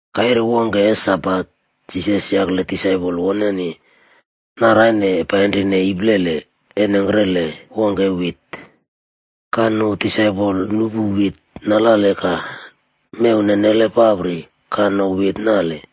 Kaire wongke e Sabat, Jisas yakle disaipol woneni naraine painrine iplele e nengkrele wongke e wit. Ka nu disaipol nuꞌpu wit nalale ka mew nenele papri ka no wit nale.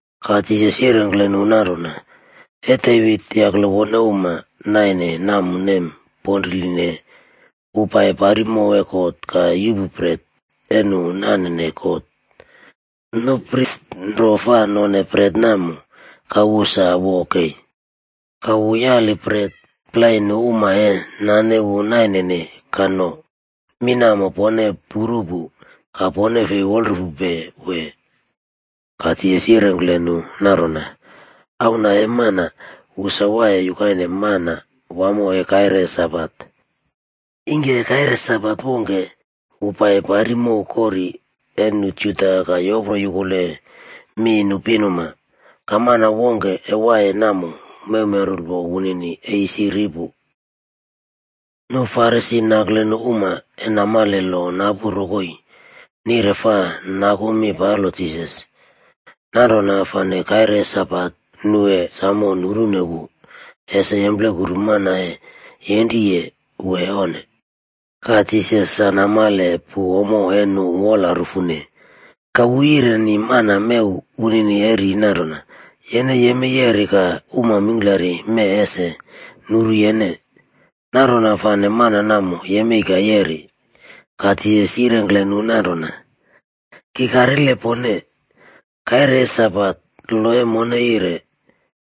Ka Jisas yirengkle nu nanrona, “E Devit yakle wone uma naine namo nem ponriline. Wu pai pari mow e God ka yuꞌpu bret e nu nanene God. Nu pris nro fa none bret namo, ka wu sa wo kei. Ka wu yali bret plai nu uma e nane wu nainene ka no. Mi namo pone puru pu, ka pone fi wolrufupe, wee?” Ka Jisas yirengkle nu nanrona, “Auna e Mana, wu sa waiye yukaine Manawamo e kaire Sabat.” Ingke kaire Sabat wongke, wu pai pari mow kori e nu Juda ka yopro yukuleye mi nu pinuma. Ka mana wongke e waiye namo mewmenrulpo wunini e isi ri pu. Nu Farisi nakle nu uma e namale lo napu rokoi, nire fa naku mi palo Jisas. Nanrona fane kaire e Sabat nu e samo nurune wu, ese yemplekuru mana e yenriye wee onne. Ka Jisas sa namale pu ommo e nu wola rufune, ka wu yireni mana mew wunini e ri nanrona, “Yene yemei yeri ka uma mingklari mee ese nuru yene.” Nanrona fane mana namo yemei ka yeri. Ka Jisas yirengkle nu nanrona, “Ki karile pone, kaire e Sabat lo e mone yire,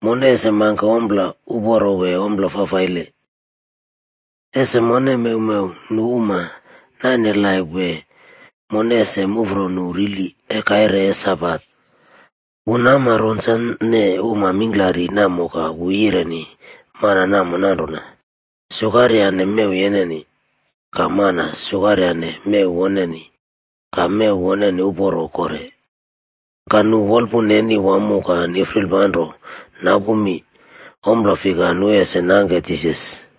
mone ese mangke ommo uporo wee ommo fafaile? Ese mone mewmew nu uma naine laip wee mone ese muꞌfro nu rili e kaire e Sabat?” Wu nama ronsane uma mingklari namo ka wu yireni mana namo nanrona, “Sukaryane mew yeneni.” Ka mana sukaryane mew woneni ka mew woneni uporo kore. Ka nu wolpuna neni wamo ka nifrilpanro napu mi, ompla fika nu ese nangke Jisas.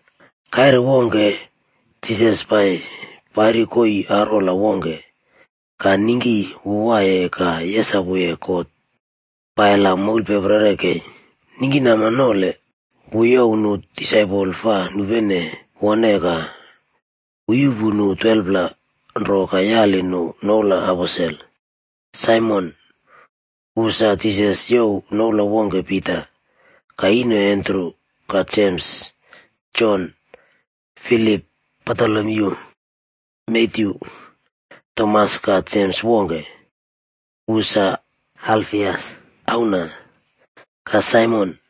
Kaire wongke, Jisas pai pari koii arwola wongke, ka ningki wu waiye ka yesapuye God pai la moulpeprere kei. Ningkinama nole wu youw nu disaipol fa nupenene wone ka wu yuꞌpu nu 12pla nro ka yali nu noula aposel:b Saimon, wu sa Jisas youw noula wongke Pita, ka ino Andru, ka Jems, Jon, Filip, Batolomyu, Matyu, Tomas ka Jems wongke, wu sa Alfias auna, ka Saimon,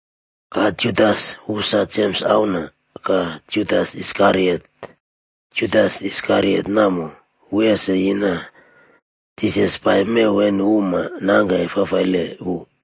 ka Judas, wu sa Jems auna, ka Judas Iskariot. Judas Iskariot namo, wu ese yina Jisas pai mew e nu uma nangke fafaile wu.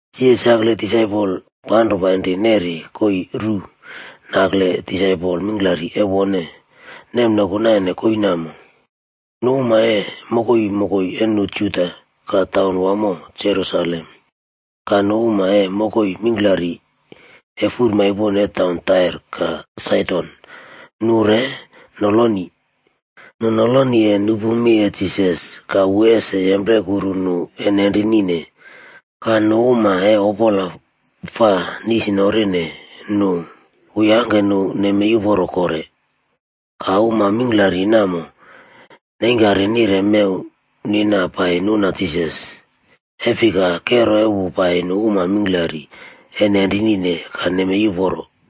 Jisas yakle disaipol panro painri neri koii ru nakle disaipol mingklari e wone nemnoku naine koii namo. Nu uma e mokoi mokoi e nu Juda ka taun wamo Jerusalem, ka nu uma e mokoi mingklari e furmaipon e taun Tair ka Saidon nu re noloni. Nu noloni e nupu mi e Jisas ka wu ese yemplekuru nu e nenrinine. Ka nu uma e opola fafaile fa nisinorine nu, wu yangke nu nemei uporo kore. Ka uma mingklari namo neingkari nire mew nina pai nuna Jisas, e fika, kero e wu pai nu uma mingklari e nenrinine ka nemei uporo.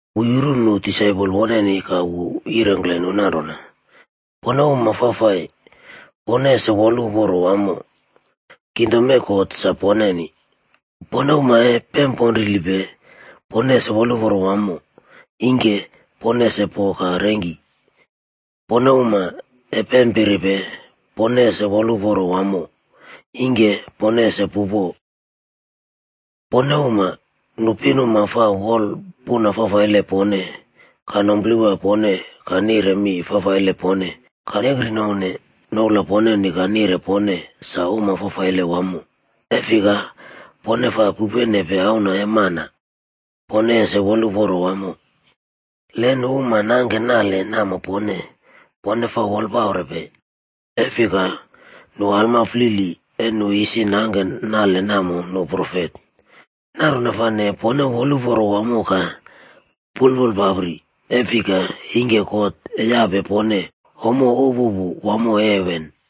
Wu yuru nu disaipol woneni ka wu yirengkle nu nanrona: “Pone uma fafai, pone ese woluporo wamo. Kingdom e God sa poneni. Pone uma e pemponrilipe, pone ese woluporo wamo, ingke pone ese po ka rengki. Pone uma e pempiripe, pone ese woluporo wamo, ingke pone ese pupo. Pone uma, nu pinuma fa wolpuna fafaile pone ka numplewa pone ka nire mi fafaile pone ka nekrinouwne noula poneni ka nire pone sa uma fafaile wamo, e fika, pone fa pupenepe Auna e Mana, pone ese woluporo wamo. “Le nu uma nangke nale namo pone, pone fa wolpaurepe. E fika nu alma flili e nu isi nangke nale namo nu profet. Nanrona fane, pone woluporo wamo ka pulpulpapri, e fika ingke God e yape pone ommo upupu wamo e heven.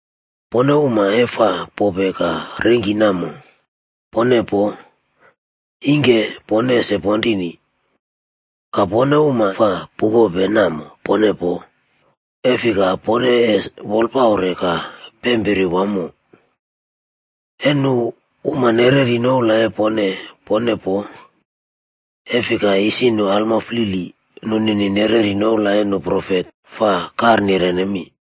Pone uma e fa pope ka rengki namo, pone poo, ingke pone ese ponrini. Ka pone uma fa pupope namo, pone poo, e fika pone ese wolpaure ka pempiri wamo. E nu uma nereri noula e pone, pone poo, e fika isi nu alma flili nunini nereri noula e nu profet fa karnirene mi.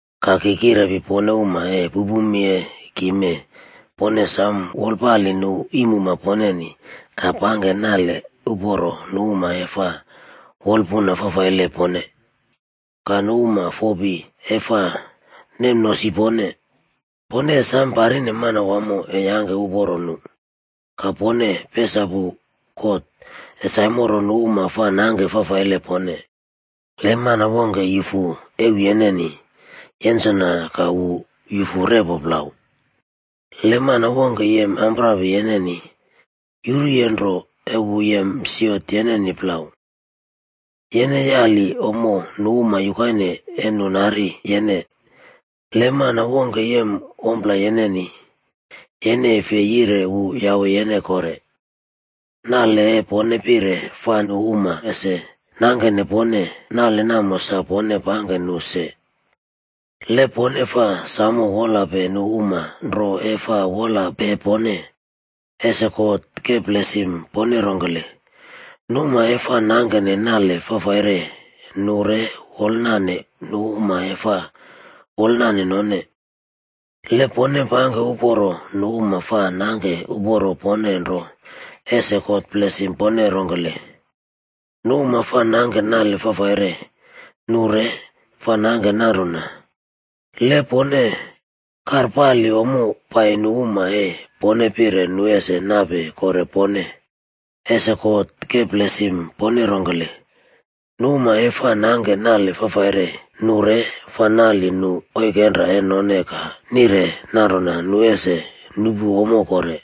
“Ka ki kirepi pone uma e pupupe mi e ki mee, pone sam wolpale nu iimuma poneni ka pangke nale uporo nu uma e fa wolpuna fafaile pone. Ka nu uma fopi e fa nemnosi pone, pone e sam parine Manawamo e yangke uporo nu. Ka pone pesapu God, e saimoro nu uma fa nangke fafaile pone. Le mana wongke yufu euw yeneni, yensona ka wu yufu repo plau. Le mana wongke yem amprapi yeneni, yuruye nro e wu yem siot yeneni plau. Yene yali ommo nu uma yukaine e nu nari yene. Le mana wongke yem ommo yeneni, yene e fi yire wu yawe yene kore. Nale e pone pire fa nu uma ese nangkene pone, nale namo sa pone pangke nu se. “Le pone fa samo wolpalepe nu uma nro e fa wolape pone, ese God ke blesim pone rongkele? Nu uma e fa nangke nale fafaire nu re wolnale nu uma e fa wolnale none. Le pone pangke uporo nu uma fa nangke uporo pone nro, ese God blesim pone rongkele? Nu uma fa nangke nale fafaire nu re fa nangke nanrona. Le pone karpali ommo pai nu uma e pone pire nu ese nape kore pone, ese God ke blesim pone rongkele? Nu uma e fa nangke nale fafaire, nu re fa nali nu oikenra e none ka nire nanrona nu ese nuꞌpu ommo kore.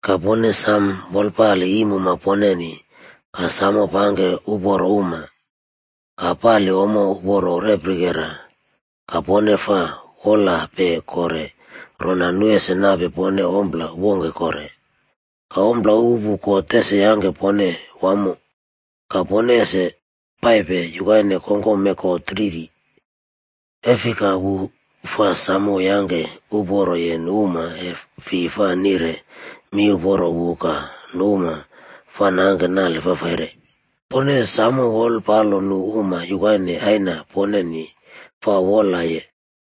Ka pone sam wolpale iimuma poneni, ka samo pangke uporo uma, ka pali ommo uma reprikera ka pone fa wolape kore rona nu ese nape pone ompla wongke kore. Ka ompla upupu God ese yangke pone wamo, ka pone ese paipe yukaine kongkom e God Riri. E fika wu fa samo yangke uporoye nu uma e fi fa nire mi uporo wu ka nu uma fa nangke nale fafaire. Pone samo wolpalo nu uma yukaine Aina poneni fa wolpaloye.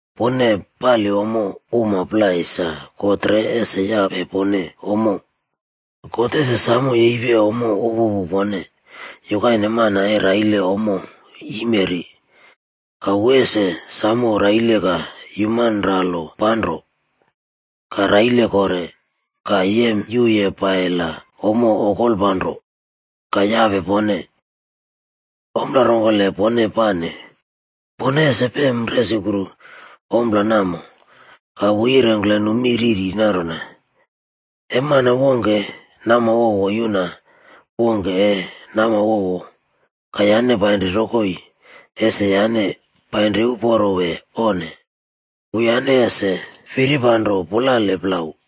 Pone pali ommo uma plai sa God re ese yape pone ommo. God ese samo yepi ommo upupu pone, yukaine mana e raile ommo yimeri, ka wu ese samo raile ka yumanralo panro, ka raile kore, ka yemyuye pai la ommo okolpanro, ka yape pone. Ompla rongkele pone pane, pone ese pem resukru ompla namo.” Ka wu yirengkle nu mi riri nanrona, “E mana wongke namwowo yuna wongke e namwowo ka yane painri rokoi, ese yane painri uporo wee? Onnele, wuyane ese firipanro pulale plau.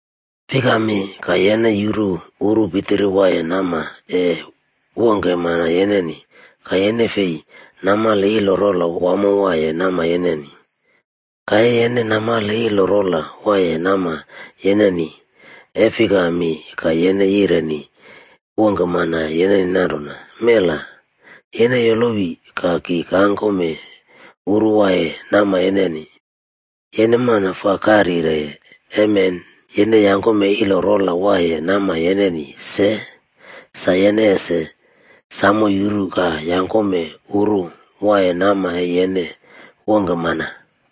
“Fikami ka yene yuru uru pitiri waiye nama e wongke mana yeneni ka yene fei namale ilo rola wamo waiye nama yeneni? Ka e yene namale ilo rola waiye nama yeneni, e fikami ka yene yireni wongke mana yeneni nanrona, ‘Mela, yene yolowi ka ki kangkome uru waiye nama yeneni.’ Yene mana fa karyireye, emen yene yangkome ilo rola waiye nama yeneni se sa yene ese samo yuru ka yangkome uru waiye nama e yene wongke mana.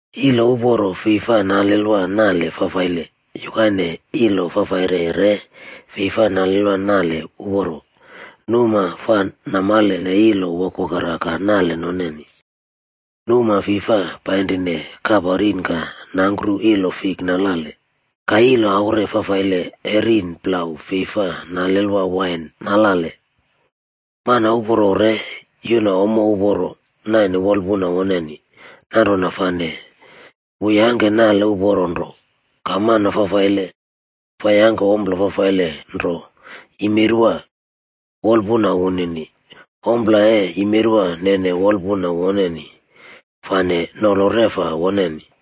“Ilo uporo fei fa nalelwa nale fafaile, yukaine e ilo fafaile re fei fa nalelwa nale uporo. Nu uma fa namalene ilo wokwokera ka nale noneni. Nu uma fi fa painrine kapa rin ka nangkru ilo fik nalale, ka ilo aure fafaile e rin plau fei fa nalelwa wain nalale. Mana uporo re yuna ommo uporo naine wolpuna woneni, nanrona fane wu yangke nale uporo nro. Ka mana fafaile fa yangke ommo fafaile nro yimerwa wolpuna woneni. Ommo e yimerwa nene wolpuna woneni fane nolo reꞌfa woneni.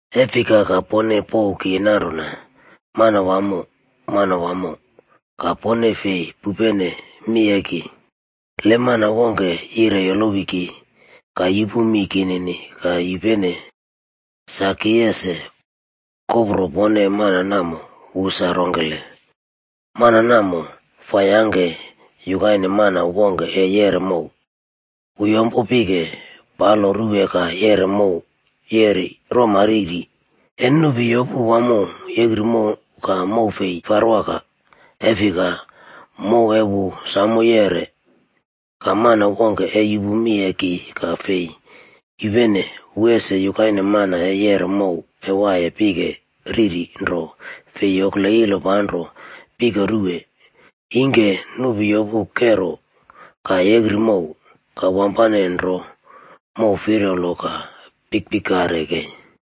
“E fika ka pone pouw ki nanrona, ‘Manawamo, Manawamo,’ ka pone fei pupene mi e ki? Le mana wongke yire yolowi ki, ka yupu mi kinini ka yupene, sa ki es kopro pone mana namo wu sa rongkele. “Mana namo fa yangke yukaine mana wongke e yeꞌre mow. Wu yompo pike palo ruwe ka yeꞌre mow yeri roma riri. E nupi yopu wamo yekri mow ka mow fi farwaka, e fika, mow e wu samo yeꞌre. Ka mana wongke e yupu mi e ki ka fei yupene, wu ese yukaine man e yeꞌre mow e waiye pike riri nro fi yokle ilo panro pike ruwe. Ingke nupi yopu kero ka yekri mow, ka wampane nro mow firpalo ka pikpikare kei.”